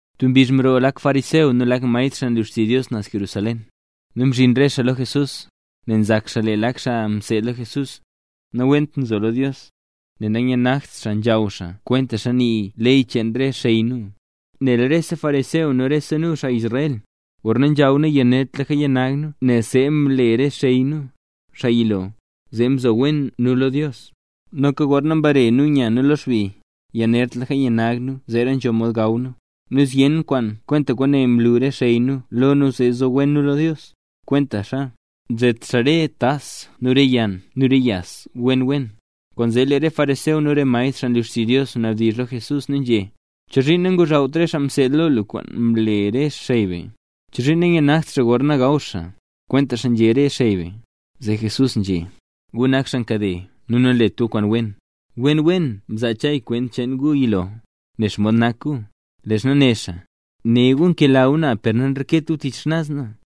Tub mbizh mroo lak fariseo nu lak maestr xaa nlu xtizh Dios naz Jerusalén. Nu mzhin re xaa lo Jesús. Nel nzak xaa lee lak xaa mseed lo Jesús, nawent nzo lo Dios, nel nanyanagt xaa nzhaw xaa kwentaxa nii ley cheen re xey nu. (Nel rese fariseo nu rese nu, xaa Israel, gorna nzhaw nu, yanertlaka yanag nu nel see mle re xey nu, xaa yilo, zee mzo wen nu lo Dios. Noka gorna mbare nu nya nu lo xbi, yanertlaka yanag nu zeera nzho mod gaw nu. Nu zyen kwaan kwenta kwaane mlu re xey nu lo nu zee zo wen nu lo Dios, kwentaxa: nzet xaa re tas nu re yann nu re yas wen wen.) Kwaanzee lee re fariseo nu re maestr, xaa nlu xtizh Dios, mnabdizh lo Jesús, nu nzhé: —¿Chozhiin nangozhawt re xaa kaseed lo lu kwaan mle re xey be? ¿Chozhiin nayanagt xaa gorna gaw xaa, kwentaxa nzhé re xey be? Zee Jesús nzhé: —¡Gu nak xaa nkade nu nanlet gu kwaan wen! Wen, wen mzaa Chay kwent cheen gu yilo, nen xomod nak gu, leezha né xaa: Né Dios: “Né gu nkela gu na, per nanreket gu tich xnaz na.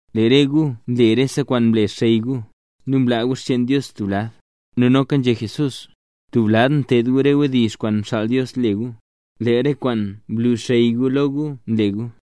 Lee re gu nle rese kwaan mle xey gu, nu mlaa gu xcheen Dios stub lad. Nu noka nzhé Jesús: —Tub lad nted gu re wdizh kwaan mxaal Dios le gu, leel re kwaan mlu xey gu lo gu nle gu.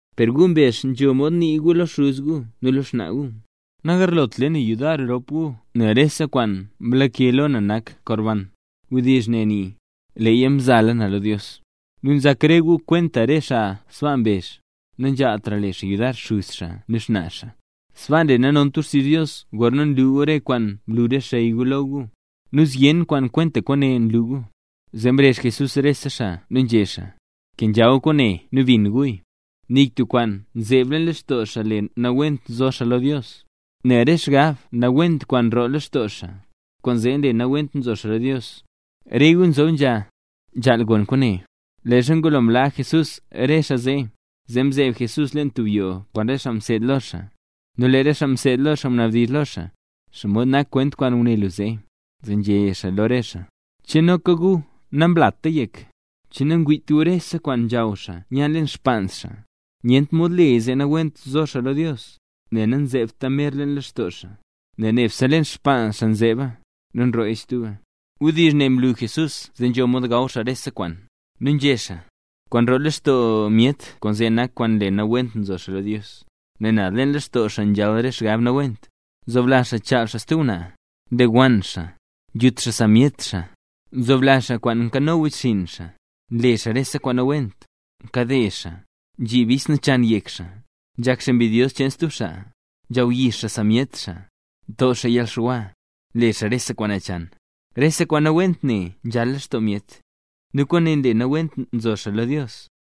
Per gu mbezh nzho mod nii gu lo xuz gu nu lo xnaa gu: “Nagarlot le na yudar rop gu nel rese kwaan mlake lo na nak korban”. (Wdizh ne nii: “Leeya mzala na lo Dios”.) Nu nzhak re gu kwenta re xaa sbaa mbezh, nanzhaaltra le xaa yudar xuz xaa nu xnaa xaa. Sbaa nle nanont gu xtizh Dios gorna nlu gu re kwaan mlu re xey gu lo gu. Nu zyen kwaan kwenta kwaane nlu gu. Zee mrezh Jesús rese xaa nu nzhé xaa: —Kenzha gu kwaane nu bin guya. Nik tub kwaan nzeeb leen lextoo xaa le nawent nzo xaa lo Dios, nel re xgab nawent kwaan nroo lextoo xaa, kwaanzee nle nawent nzo xaa lo Dios. ¡Re gu nzob nzha, nzhaal gon kwaane! Leezha ngulo mlaa Jesús re xaa zee, zee mzeeb Jesús leen tub yoo kwaan re xaa mseed lo xaa. Nu lee re xaa mseed lo xaa mnabdizh lo xaa: —¿Xomod nak kwent kwaan nguné lu zee? Zee nzhé xaa lo re xaa: —¿Che noka gu, namlata yek? ¿Che nangwiit gu rese kwaan nzhaw xaa nya leen xpaans xaa, nyent mod leya zee nawent nzo xaa lo Dios? Nel namzeebta mer leen lextoo xaa, nel nebse leen xpaans xaa nzeeba, nu nrooya stuba. Wdizh ne mlu Jesús zee nzho mod gaw xaa rese kwaan. Nu nzhé xaa: —Kwaan nroo lextoo myet, kwaanzee nak kwaan nle nawent nzo xaa lo Dios. Nel naz leen lextoo xaa nzhal re xgab nawent: nzoblazh xaa chaal xaa stub ngwnaa, nlewann xaa, nzhut xaa sa myet xaa, nzoblazh xaa kwaan nkano wechxinn xaa, nle xaa rese kwaan nawent, nkade xaa, nzhib bis nachan yek xaa, nzhak xaa enbidyos cheen stub xaa, nzhawyix xaa sa myet xaa, nto xaa yalxwa, nle xaa rese kwaan nachan. Rese kwaan nawent ne nzhal lextoo myet, nu kwaane nle nawent nzo xaa lo Dios.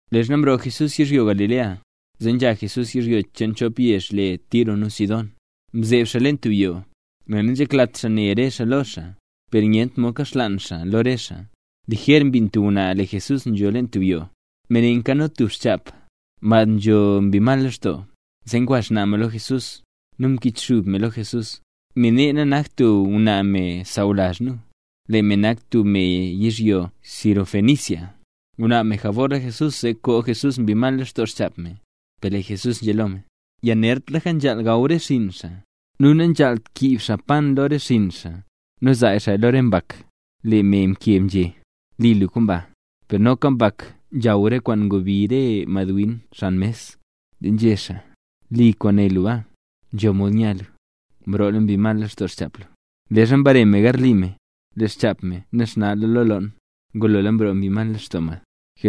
Leezha mroo Jesús yizhyo Galilea, zee nzha Jesús yizhyo cheen chop yezh le Tiro nu Sidón. Mzeeb xaa leen tub yoo, nel nanzheklat xaa ne re xaa lo xaa, per nyent mod nkaxlaan xaa lo re xaa. Lijer mbin tub ngwnaa lee Jesús nzho leen tub yoo. Me ne nkano tub xchap, mad nzho mbi mal lextoo. Zee ngwa xnaa mad lo Jesús, nu mkichxub me lo Jesús. Me ne nanakt tub ngwnaa me sawlazh nu, lee me nak tub me yizhyo Sirofenicia. Ngunaab me jabor lo Jesús zee koo Jesús mbi mal lextoo xchap me. Per lee Jesús nzhé lo me: —Yanertlaka nzhaal gaw re xinn xaa, nu nanzhaalt kiib xaa pan lo re xinn xaa, nu zaa xaaya lo re mbak. Lee me mkeb nzhé: —Li lu kwaan ba; per noka mbak nzhaw re kwaan ngobi re madwin xan mes. Zee nzhé xaa: —Li kwaan né lu baa, nzho mod nya lu. Mroola mbi mal lextoo xchap lu. Leezha mbare me garli me, lee xchap me naxna lo loon. Ngulola mroo mbi mal lextoo mad.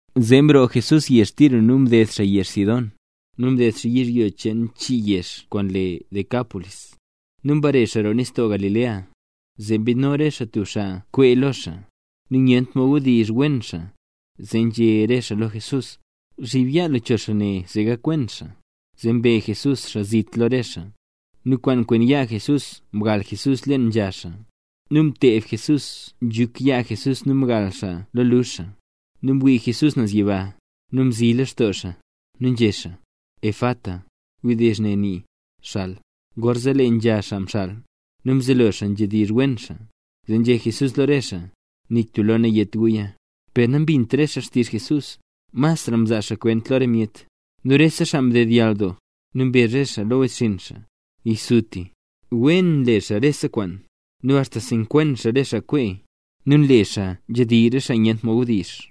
Zee mroo Jesús yezh Tiro nu mded xaa yezh Sidón, nu mded xaa yizhyo cheen chii yezh kwaan le Decápolis. Nu mbare xaa roo nistoo Galilea. Zee mbidno re xaa tub xaa nkwee lo xaa, nu nyent mod wdizh wen xaa, zee nzhé re xaa lo Jesús: —Zhib yaa lu cho xaa ne, zee gakwen xaa. Zee mbe Jesús xaa zit lo re xaa, nu kwaan kwen yaa Jesús mgal Jesús leen nzha xaa. Nu mted Jesús nzhuk yaa Jesús nu mgal xaa lo luzh xaa. Nu mwii Jesús naz yiba, nu mzilextoo xaa, nu nzhé xaa: —¡Efata! (Wdizh ne nii: “¡Xal!”) Gorzee lee nzha xaa mxal, nu mzelo xaa nzhedizh wen xaa. Zee nzhé Jesús lo re xaa: —Nik tub lo nayét guya. Per nambint re xaa xtizh Jesús, masra nzaa xaa kwent lo re myet. Nu rese xaa mdedyall doo. Nu mbezh re xaa lo wechxinn xaa: —¡Yisutisuti! ¡Wen nle xaa rese kwaan! ¡Nu axta nsekwen xaa re xaa nkwee, nu nle xaa nzhedizh re xaa nyent mod wdizh!